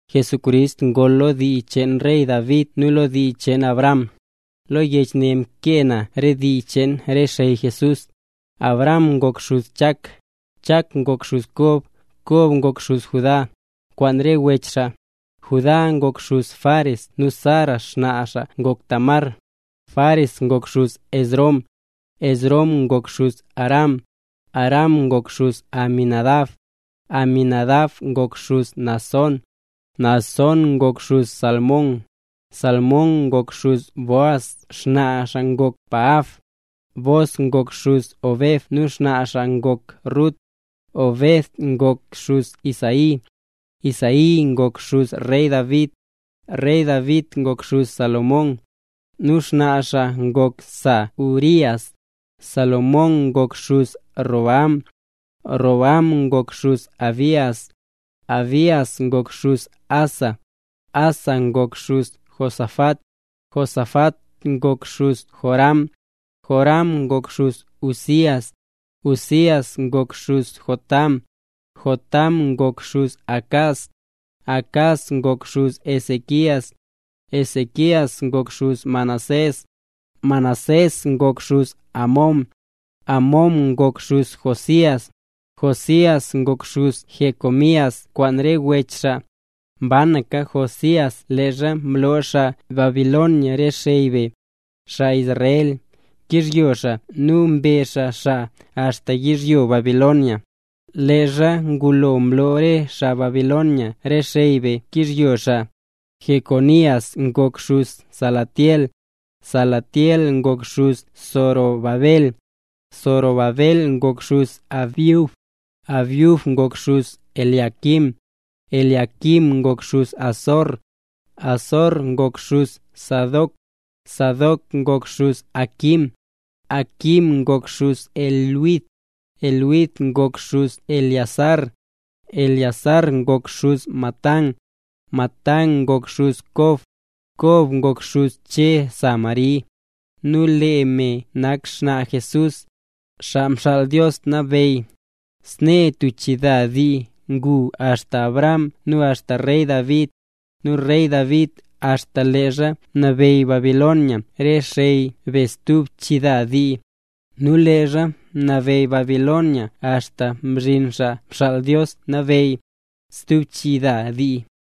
Jesucrist ngol lo dii cheen rey David nu lo dii cheen Abraham. Lo yech ne mkee na re dii cheen re xey Jesús: Abraham ngok xuz Chak, Chak ngok xuz Kob, Kob ngok xuz Judá, kwaan re wech xaa. Judá ngok xuz Fares nu Zara, nu xnaa xaa ngok Tamar. Fares ngok xuz Esrom, Esrom ngok xuz Aram. Aram ngok xuz Aminadab, Aminadab ngok xuz Naasón, Naasón ngok xuz Salmón. Salmón ngok xuz Booz, nu xnaa xaa ngok Rahab. Booz ngok xuz Obed, nu xnaa xaa ngok Rut. Obed ngok xuz Isaí. Isaí ngok xuz rey David, rey David ngok xuz Salomón, nu xnaa xaa ngok sa Urías. Salomón ngok xuz Roboam, Roboam ngok xuz Abías, Abías ngok xuz Asa. Asa ngok xuz Josafat, Josafat ngok xuz Joram, Joram ngok xuz Uzías. Uzías ngok xuz Jotam, Jotam ngok xuz Acaz, Acaz ngok xuz Ezequías. Ezequías ngok xuz Manasés, Manasés ngok xuz Amón, Amón ngok xuz Josías. Josías ngok xuz Jeconías kwaan re wech xaa, mbanaka Josías leezha mloo xaa Babilonia re xey be, xaa Israel, xkyizhyo xaa nu mbe xaa xaa axta yizhyo Babilonia. Leezha ngulo mloo re xaa Babilonia re xey be xkyizhyo xaa: Jeconías ngok xuz Salatiel, Salatiel ngok xuz Zorobabel. Zorobabel ngok xuz Abiud, Abiud ngok xuz Eliaquim, Eliaquim ngok xuz Azor. Azor ngok xuz Sadoc, Sadoc ngok xuz Aquim, Aquim ngok xuz Eliud. Eliud ngok xuz Eleazar, Eleazar ngok xuz Matán, Matán ngok xuz Kob. Kob ngok xuz Che sa Mari, nu lee me nak xnaa Jesús, Xaa Mxaal Dios Nabeyy. Snee tub chida dii ngu axta Abraham nu axta rey David, nu rey David axta leezha mnabeyy Babilonia re xey be stub chida dii, nu leezha mnabeyy Babilonia axta mzhin Xaa Mxaal Dios Nabeyy, stub chida dii.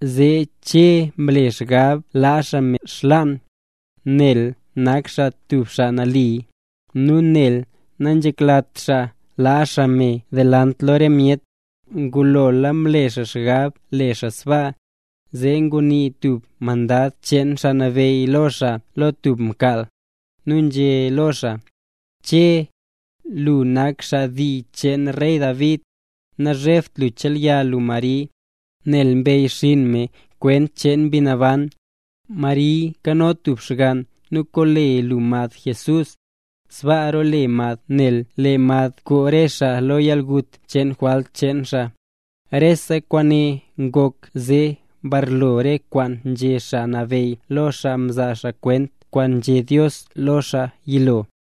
Zee Che mle xgab laa xaa me xlaan, nel nak xaa tub xaa nali, nu nel nanzheklat xaa laa xaa me delant lo re myet. Ngulo mle xaa xgab le xaa sbaa, zee ngunii tub mandad cheen Xaa Nabeyy lo xaa lo tub mkaal, nu nzhé lo xaa: —Che, lu nak xaa dii cheen rey David, nazhebt lu chelya lu Mari, nel mbeyyxiin me kwent cheen Mbi Naban. Mari kano tub xgann nu kole lu mad Jesús, sbaa role mad nel lee mad koo re xaa xaa lo yalgut cheen jwalt cheen xaa. Rese kwaane ngok zee mbarlo re kwaan nzhé Xaa Nabeyy lo xaa mzaa kwent kwaan nzhé Dios lo lee xaa yilo: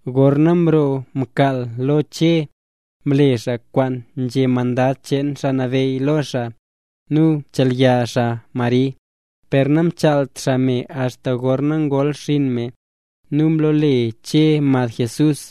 Gorna mroo mkaal lo Che, mle xaa kwaan nzhé mandad cheen Xaa Nabeyy lo xaa, nu mchelya xaa Mari. Per namchaalt xaa me axta gorna ngol xinn me. Nu mlole Che mad Jesús.